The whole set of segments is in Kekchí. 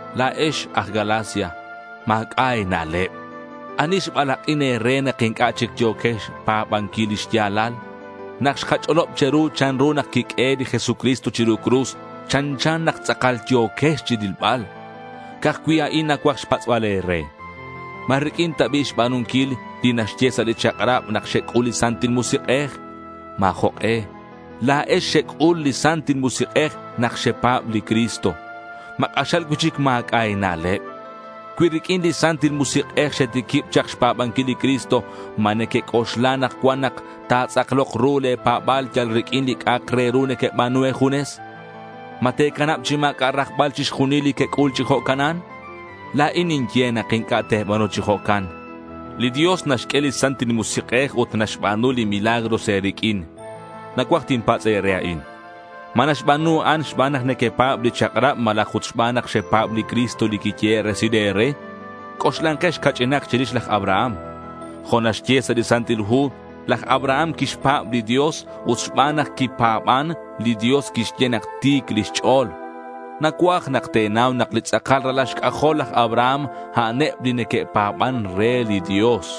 La̱ex aj Galacia, ma̱c'a' e̱na'leb. ¿Ani xbalak'in e̱re nak inc'a' chic yo̱quex xpa̱banquil li xya̱lal? Nak xkach'olob che̱ru chanru nak quiq'uehe' li Jesucristo chiru cruz, chanchan nak tz'akal yo̱quex chirilbal. Ca'aj cui' a'in nacuaj xpatz'bal e̱re. ¿Ma riq'uin ta bi' xba̱nunquil li naxye sa' li chak'rab nak xec'ul li Santil Musik'ej? Ma̱ jok'e. La̱ex xec'ul li Santil Musik'ej nak xepa̱b li Cristo. ¿Ma k'axal cui'chic ma̱c'a' e̱na'leb? Cui riq'uin li Santil Musik'ej xetiquib chak xpa̱banquil li Jesucristo, ¿ma nequec'oxla anakcuan nak ta̱tz'aklok ru le̱ pa̱ba̱l yal riq'uin li c'a'ak re ru nequeba̱nu e̱junes? ¿Ma te̱canab chi ma̱c'a' rajbal chixjunil li quec'ul chi jo'canan? La̱in ninye nak inc'a' te̱ba̱nu chi jo'can. Li Dios naxq'ue li Santil Musik'ej ut naxba̱nu li milagros e̱riq'uin. Nacuaj tinpatz' e̱re a'in: ¿ma naxba̱nu a'an xban nak nequepa̱b li chak'rab malaj ut xban nak xepa̱b li Cristo li quiyehe' resil e̱re? C'oxlankex ca'ch'inak chirix laj Abraham. Jo' naxye sa' li Santil Hu, laj Abraham quixpa̱b li Dios ut xban nak quipa̱ban, li Dios quixye nak ti̱c chic lix ch'o̱l. Nacuaj nak te̱nau nak li tz'akal ralal xc'ajol laj Abraham, a'aneb li neque'pa̱ban re li Dios.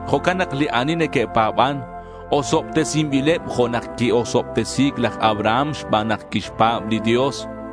Jo'can nak li ani neque'pa̱ban, osobtesinbileb jo' nak qui-osobtesi̱c laj Abraham xban nak quixpa̱b li Dios.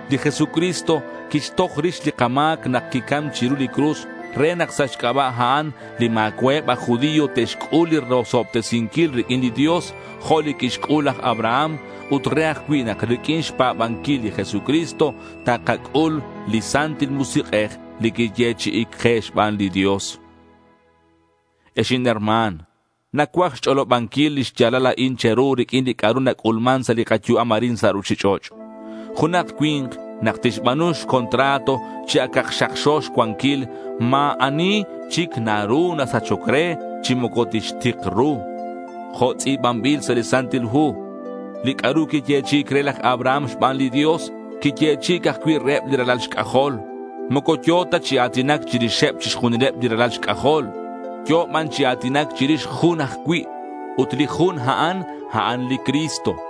Li Jesucristo quixtoj rix li kama̱c nak quicam chiru li cruz re nak sa' xc'aba' a'an li ma̱cua'eb aj judío te'xc'ul li rosobtesinquil riq'uin li Dios jo' li quixc'ul laj Abraham ut re ajcui' nak riq'uin xpa̱banquil li Jesucristo takac'ul li Santil Musik'ej li quiyechi'i̱c ke xban li Dios. Ex inherma̱n, nacuaj xch'olobanquil lix ya̱lal a'in che̱ru riq'uin li c'a'ru nac'ulman sa' li kayu'am arin sa' ruchich'och'. Junak cui̱nk nak tixba̱nu xcontrato, chi acak xakxo xcuanquil, ma̱ ani chic naru nasachoc re, chi moco tixtik ru. Jo' tz'i̱banbil sa' li Santil Hu, li c'a'ru quiyechi'i̱c re laj Abraham xban li Dios, quiyechi'i̱c ajcui' reheb li ralal xc'ajol. Moco yo̱ ta chi a̱tinac chirixeb chixjunileb li ralal xc'ajol. Yo̱ ban chi a̱tinac chirix jun ajcui'. Ut li jun a'an, a'an li Cristo.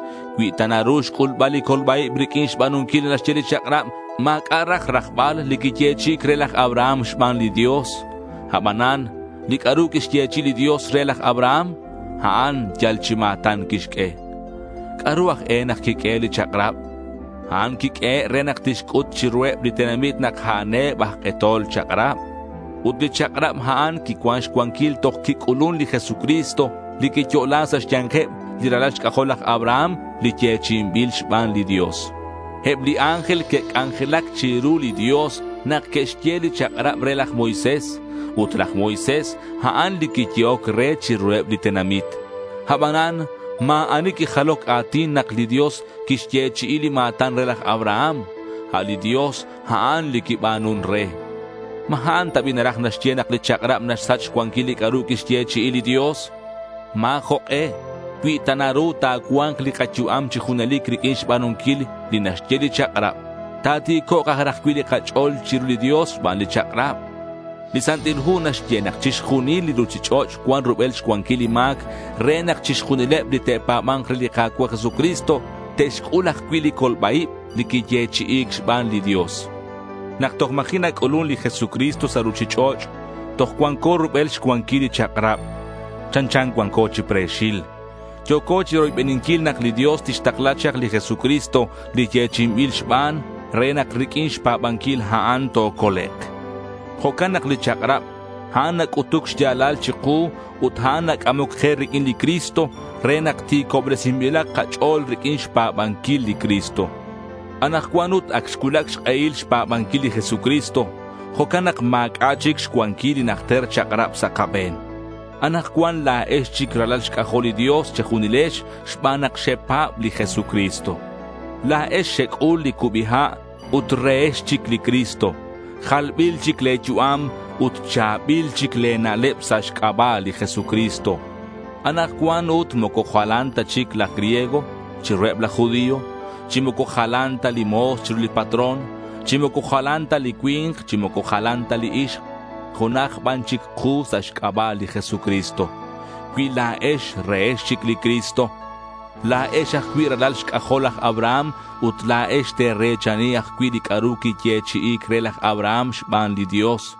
Cui ta naru xc'ulbal li colba-ib riq'uin xba̱nunquil li naxye li chak'rab, ma̱c'a' raj rajbal li quiyechi'i̱c re laj Abraham xban li Dios. Abanan li c'a'ru quixyechi'i li Dios re laj Abraham, a'an yal chi ma̱tan quixq'ue. ¿C'a'ru aj e nak quiq'uehe' li chak'rab? A'an quiq'uehe' re nak tixc'ut chiruheb li tenamit nak a'aneb aj k'etol chak'rab. Ut li chak'rab a'an quicuan xcuanquil toj quic'ulun li Jesucristo li quiyo'la sa' xya̱nkeb li ralal xc'ajol laj Abraham, li yechi'inbil xban li Dios. Eb li ángel que'c'anjelac chiru li Dios nak que'xye li chak'rab re laj Moisés; ut laj Moisés, a'an li quiyehoc re chiruheb li tenamit. Abanan ma̱ ani quijaloc a̱tin nak li Dios quixyechi'i li ma̱tan re laj Abraham. A' li Dios, a'an li quiba̱nun re. ¿Ma a'in ta bi' naraj naxye nak li chak'rab naxsach xcuanquil li c'a'ru quixyechi'i li Dios? ¡Ma̱ jok'e! Cui ta naru ta̱cua̱nk li kayu'am chi junelic riq'uin xba̱nunquil li naxye li chak'rab, ta̱ti̱cok' aj raj cui' li kach'o̱l chiru li Dios xban li chak'rab. Li Santil Hu naxye nak chixjunil li ruchich'och' cuan rubel xcuanquil li ma̱c re nak chixjunileb li te'pa̱ba̱nk re li Ka̱cua' Jesucristo te'xc'ul ajcui' li colba-ib li quiyechi'i̱c xban li Dios. Nak toj ma̱ji' nac'ulun li Jesucristo sa' ruchich'och', toj cuanco rubel xcuanquil li chak'rab. Chanchan cuanco chi pre̱xil. Yo̱co chiroybeninquil nak li Dios tixtakla chak li Jesucristo li yechi'inbil xban, re nak riq'uin xpa̱banquil a'an tocolek'. Jo'can nak li chak'rab, a'an nac'utuc xya̱lal chiku ut a'an nac'amoc ke riq'uin li Cristo re nak ti̱cobresinbilak kach'o̱l riq'uin xpa̱banquil li Cristo. Anakcuan ut ac xcuulac xk'ehil xpa̱banquil li Jesucristo. Jo'can nak ma̱c'a' chic xcuanquil li najter chak'rab sa' kabe̱n. Anakcuan la̱ex chic ralal xc'ajol li Dios che̱junilex xban nak xepa̱b li Jesucristo. La̱ex xec'ul li cubi ha' ut rehex chic li Cristo. Jalbil chic le̱ yu'am ut cha̱bil chic le̱ na'leb sa' xc'aba' li Jesucristo. Anakcuan ut moco jalan ta chic laj griego chiruheb laj judío, chi moco jalan ta li mo̱s chiru li patrón, chi moco jalan ta li cui̱nk, chi moco jalan ta li ixk. Junaj ban chic ku sa' xc'aba' li Jesucristo. Cui la̱ex rehex chic li Cristo, la̱ex ajcui' ralal xc'ajol laj Abraham ut la̱ex te̱re̱chani ajcui' li c'a'ru quiyechi'i̱c re laj Abraham xban li Dios.